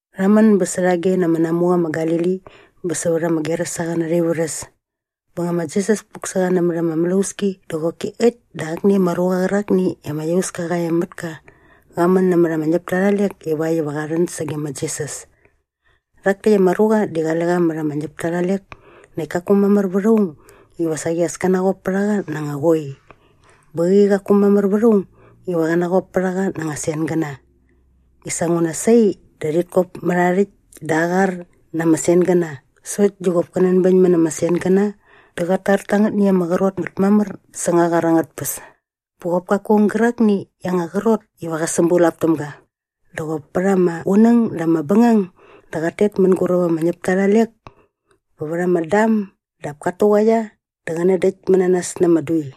Rha män bä särhage na ama namuqa ma Galili bä sävät ama Gerasaqäna arha ivärhäs. Bä nga ma Jisas puk sä qa nämät ama mlauski dä qoki äkt dä akni ama ruqa qärakni i ama iauska qa e mät ka qa män nämät ama ñäpta arha lek ivakt iva qa rhän sage ma Jisas. Rhak täkt ama ruqa di qale qa mät ama ñäpta arha lek näkt kaku mamär vät aung iva saqi as kä naqop pät a qa na anga qoi bä qäqi qaku mamär vät aung iva qä naqop pät a qa na anga sengäna. I sa nguna sai dä rhit kop mät aa rhäkt dä aa qar na ama sengäna sokt di qop kä nänbäñmät na ama sengäna dä qat tar ta angätni i ama qrot ngät mamär säng aa qar angät tpäs. Bä qop kaku aung gärakni i aa anga qrot iva qä sämbulap täm ga. Dä qop pät ama qunäng dä ama bängang dä qat tet mänguräp ama ñäpta arha lek bä vät ama dam dap kat tuqaia dä qä nädäktmät na nas na ama dui.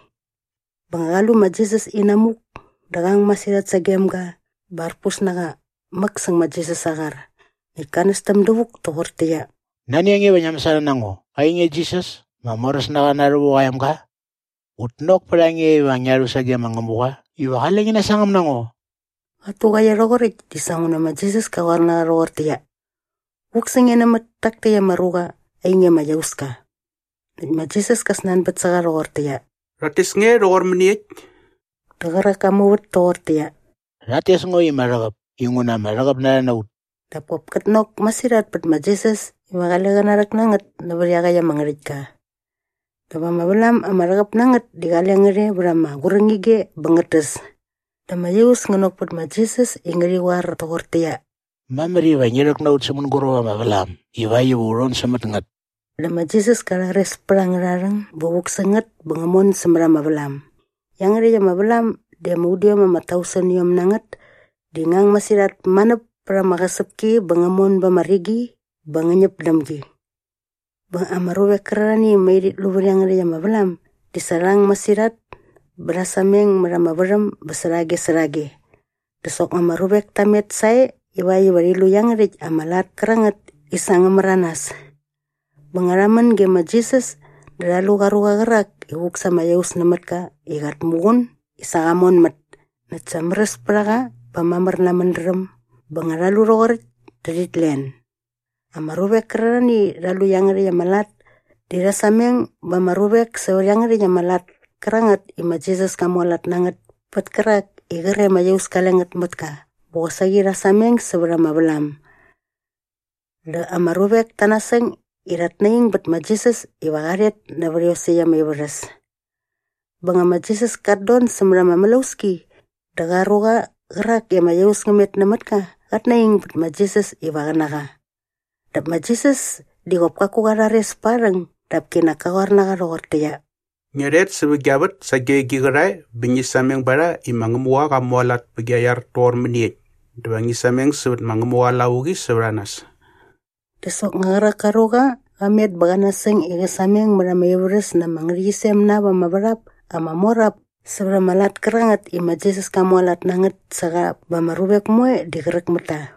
Bä nga qa lu ma Jisas inamuk dä qa ang masirhat sagem ga bä arpus na qa mäk säng ma Jisas aa qar. Näkt ka nästäm dävuk toqortäqyia, “Nani a nge iva ngia mäsana na ngo, ainge Jisas ma Moräsnaqa Na Rhävuk aa emga? Ngut nok pät a nge iva ngia rhu sage ma Ngämuqa iva qale ngi nasangäm na ngo.” Qat tuqaia rhoqoräkt di sa nguna ma Jisas ka qoar na qa rhoqortäqyia, “Vuk sä nge nämät tak täkt ama ruqa ainge ama iauska!” Näkt ma Jisas ka snanbät sä qa rhoqortäqyia, “Rhat tes nge rhoqor mäniekt?” Dä qärak ka muvät toqortäqyia, “Rhat tes ngo i ma Rhäqäp inguna ama rhäqäp na rha na ut.” Dap kop kät nok masirhat pät ma Jisas iva qale qä narhäk na ngät nävät iaqäkt ama ngärhäktka. Dap ama vlam ama rhäqäp na ngät di qale ngät e vät ama qurängige bä ngät täs. Dä ama iaus ngä nok pät ma Jisas i ngärhi qoar toqortäqyia, “Mamär iva ngi rhäk na ut sä mänguräp ama vlam ivakt iva u rhon sämät ngät.” Dä ma Jisas ka rhares pät angärha rhäng bä vuk sä ngät bä ngä mon sämät ama vlam. Iangärhäkt ama vlam di ama udiom ama tauseniom na ngät di ngä ang masirhat manäp pät ama qäsäpki bä ngä mon ba ama rigi bä ngä ñäp däm gi. Bä ama ruvek kärarhani i mai rhit lu vät iangärhäkt ama vlam di sa rha ang masirhat bä rha sameng mät ama värhäm bä särhage särhage. Dä soknga ama ruvek ta met sae ivakt iva rhi lu iangärhäkt ama lat kärangät i sa ngä märanas. Bä nga rha män ge ma Jisas dä rha lu qa ruqa qärak i vuk sa ama iaus nämät ka i qat muqun i sa qa monmät näkt sa märäs pät a qa bä mamär na aa mädräm bä nga rha lu rhoqoräkt dä rhit len. Ama ruvek kärarhani i rha lu iangärhäkt ama lat di rha sameng ba ama ruvek sävät iangärhäkt ama lat kärangät i ma Jisas ka mualat na ngät pät kärak i qre ama iaus kale ngät mät ka bä qosaqi rha sameng sävät ama vlam. Dä ama ruvek ta nasäng i rhat naing bät ma Jisas iva qa rhet nävä iosäkt arha ivärhäs. Bä nga ma Jisas kat don sämät ama mlauski dä qa ruqa qärak i ama iaus ngä met nämät ka qät naing bät ma Jisas iva qä na qa. Dap ma Jisas di qop kaku qa rhares pät aa rhäng dap kinak ka qoar na qa rhoqortäqyia, “Ngia rhet sävät gia vät sage gi qärhae bä ngi sameng ba rha i ma Ngämuqa qa mualat pä gia iar toqor mäniekt dä va ngi sameng sävät ma Ngämuqa aa lavuqi sävät a nas.” Dä soknga qärak ka ruqa qa met bä qä nasäng i qä sameng mät ama ivärhäs na ama ngärhäqyisem na ap ama värhap ama mor ap sävät ama lat kärangät i ma Jisas ka mualat na ngät sä qa bä ama ruvek moe di qräk mät ta.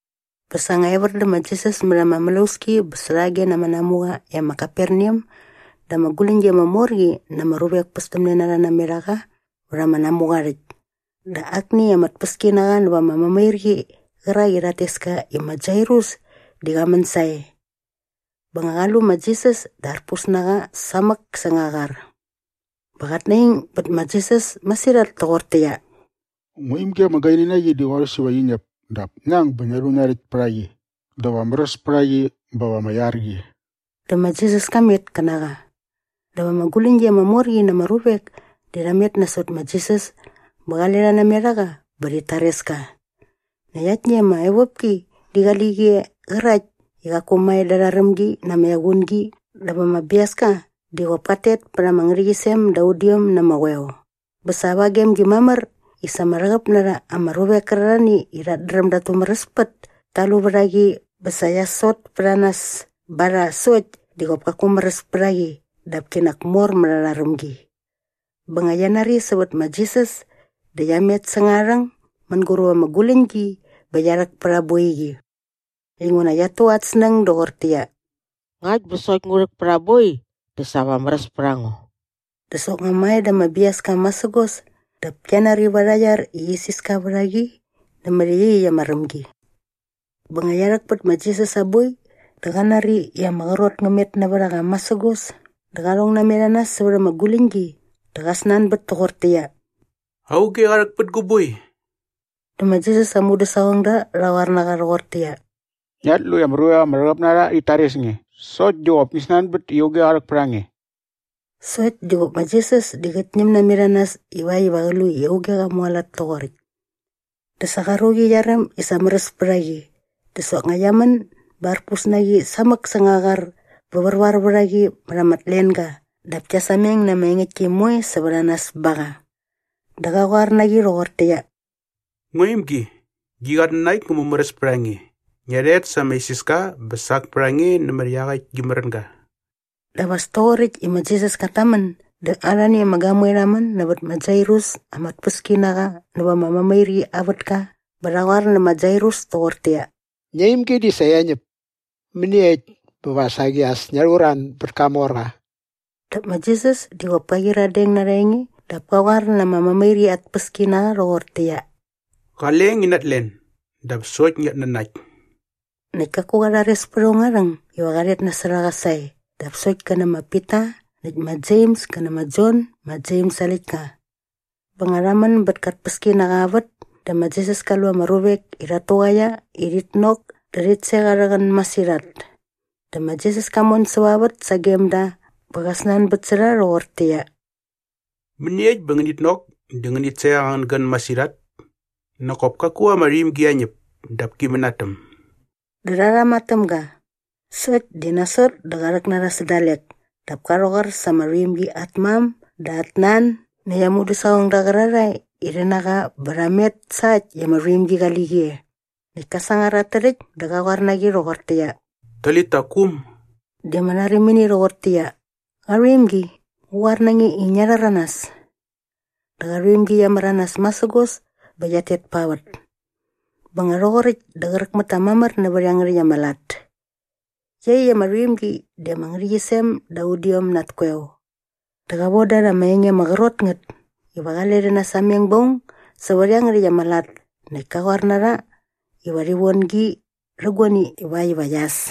Bä sa nga evär dä ma Jisas mät ama mlauski bä särhage na ama namuqa e ma Kaperneam dä ama guläñgi ama mor qi na ama ruvek pästämne na rha namet a qa vät ama namuqa aa rhäkt. Dä akni ama tpäskinaqa näva ama mämairqi qärak i rhat tes ka i ma Jairus di qa män sae. Bä nga qa lu ma Jisas dä arpus na qa samäk säng aa qar bä qat naing bät ma Jisas masirhat toqortäqyia, “Ngua imgi ama gaini na qi di qorhäs iva qi ñäp dap ngi ang bä ngia rhu ngia rhäkt pät a qi dä va märäs pät a qi bä va ama iar qi.” Dä ma Jisas ka met kä na qa. Dap ama guläñgi ama mor qi na ama ruvek di rha met nasot ma Jisas bä qale rha namet a qa bä rhit tares ka. Näkt aktni ama evopki di qali qi e qärakt i qaku mae da arha rämgi na ama equngi dap ama biaska di qop kat tet pät ama ngärhäqyisem da udiom na ama qoeo. Bä sa ava gem gi mamär i sa ama rhäqäp na rha ama ruvek kärarhani i rhat dräm dat tumäräspät ta lu vät a qi bä sa qia sot pät a nas ba rha sokt di qop kaku märäs pät a qi dap kinak mor mät arha rämgi. Bä nga qia nari sävät ma Jisas dä qia met säng aa rhäng mänguräp ama guläñgi bä qia rhäk pät aa boiqi inguna qiat tu arhä snäng doqortäqyia, “Ngakt bä sokt ngu rhäk pät aa boi dä sa va märäs pät a ngo.” Dä soknga mae da ama biaska masägos dap kia nari va arha iar i isiska vät a qi nämät iaqyäkt ama rämgi. Bä nga qia rhäk pät ma Jisas aa boi dä qa nari i ama qrot ngä met nävät a qa masägos dä qa rhong namet a nas sävät ama guläñgi dä qa snanbät toqortäqyia, “Auge qa rhäk pät gu boi?” Dä ma Jisas aa mudäsaqongda rha qoar na qa rhoqortäqyia, “Ngiat lu i ama rhäqäp na rha ama ruvek tit tares nge sokt di qop ngi snanbät i auge qa rhäk pät a nge?” Sokt di qop ma Jisas di qät ñäm namet a nas ivakt iva qä lu i auge qa mualat toqoräkt. Dä sa qa ruqi qia räm i sa märäs pät a qi dä soknga qia män bä arpus na qi samäk säng aa qar bä värvar vät a qi mät ama tlenga dap kia sameng na ama engäktki moe sävät a nas ba qa. Dä qa qoar na qi rhoqortäqyia, “Ngua imgi, gi qatnanakt ngä mumäräs pät a nge. Ngia rhet sa ama isiska bä sak pät a nge nämät iaqäkt gi märänga.” Dap as toqoräkt i ma Jisas kat tamän dä arhani ama gamoe rha män nävät ma Jairus ama narhoerqa näva ama mämairqi aa vätka bä rha qoar nä ma Jairus toqortäqyia, “Ngia imgi di sa qia ñäp. Mäniekt bä va saqi as ngia rhuruan bät kamorqa?” Dap ma Jisas di qop ka qyiradeng na arha enge dap ka qoar na ama mämairqi at narhoerqa rhoqortäqyia, “Qale ngi natlen, dap sokt ngiat nanakt.” Näkt kaku qa rhares pät aung aa rhäng iva qa rhet nasot a qa sae dap sokt kä nä ma Pita näkt ma Jems kä nä ma Jon ma Jems aa läktka. Bä nga rha män bät ka tpäskinaqa aa vät dä ma Jisas ka lu ama ruvek i rhat tuqaia i rhit nok dä rhit sek arhä qän masirhat. Dä ma Jisas ka mon säva vät sagem da bä qa snanbät sä rha rhoqortäqyia, “Mäniekt bä ngänit nok dä ngänit sek angän gän masirhat? Nak kop kaku ama rhuimgi qia ñäp dap ki mänatäm.” Dä rha rhama täm ga. Sokt di nasot dä qa rhäk na rha sä dalek dap ka rhäqoar sa ama rhuimgi at mam dä at nan näkt aa mudäsaqongda qärarhae i rhi na qa bä rha met sa äkt i ama rhuimgi qali qi e. Näkt ka sangar at tärhäkt dä qa qoar na qi rhoqortäqyia, “Talita kum.” Di ama rharimini rhoqortäqyia, “Qarhuimgi, ngu qoar na nge i ngia rhäranas.” Dä qa rhuimgi qia märanas masägos bä qiat tet pa vät. Bä nga rhoqoräkt dä qräk mät ta mamär nävät iangärhäkt ama lat. Iaqyäkt ama rhuimgi di ama ngärhäqyisem da udiom na at koeo. Dä qa voda rha ama enge ama qrot ngät iva qale rhi nasameng ba aung sävät iangärhäkt ama lat näkt ka qoar na rha iva rhi von gi rhä guani ivakt iva qia äs.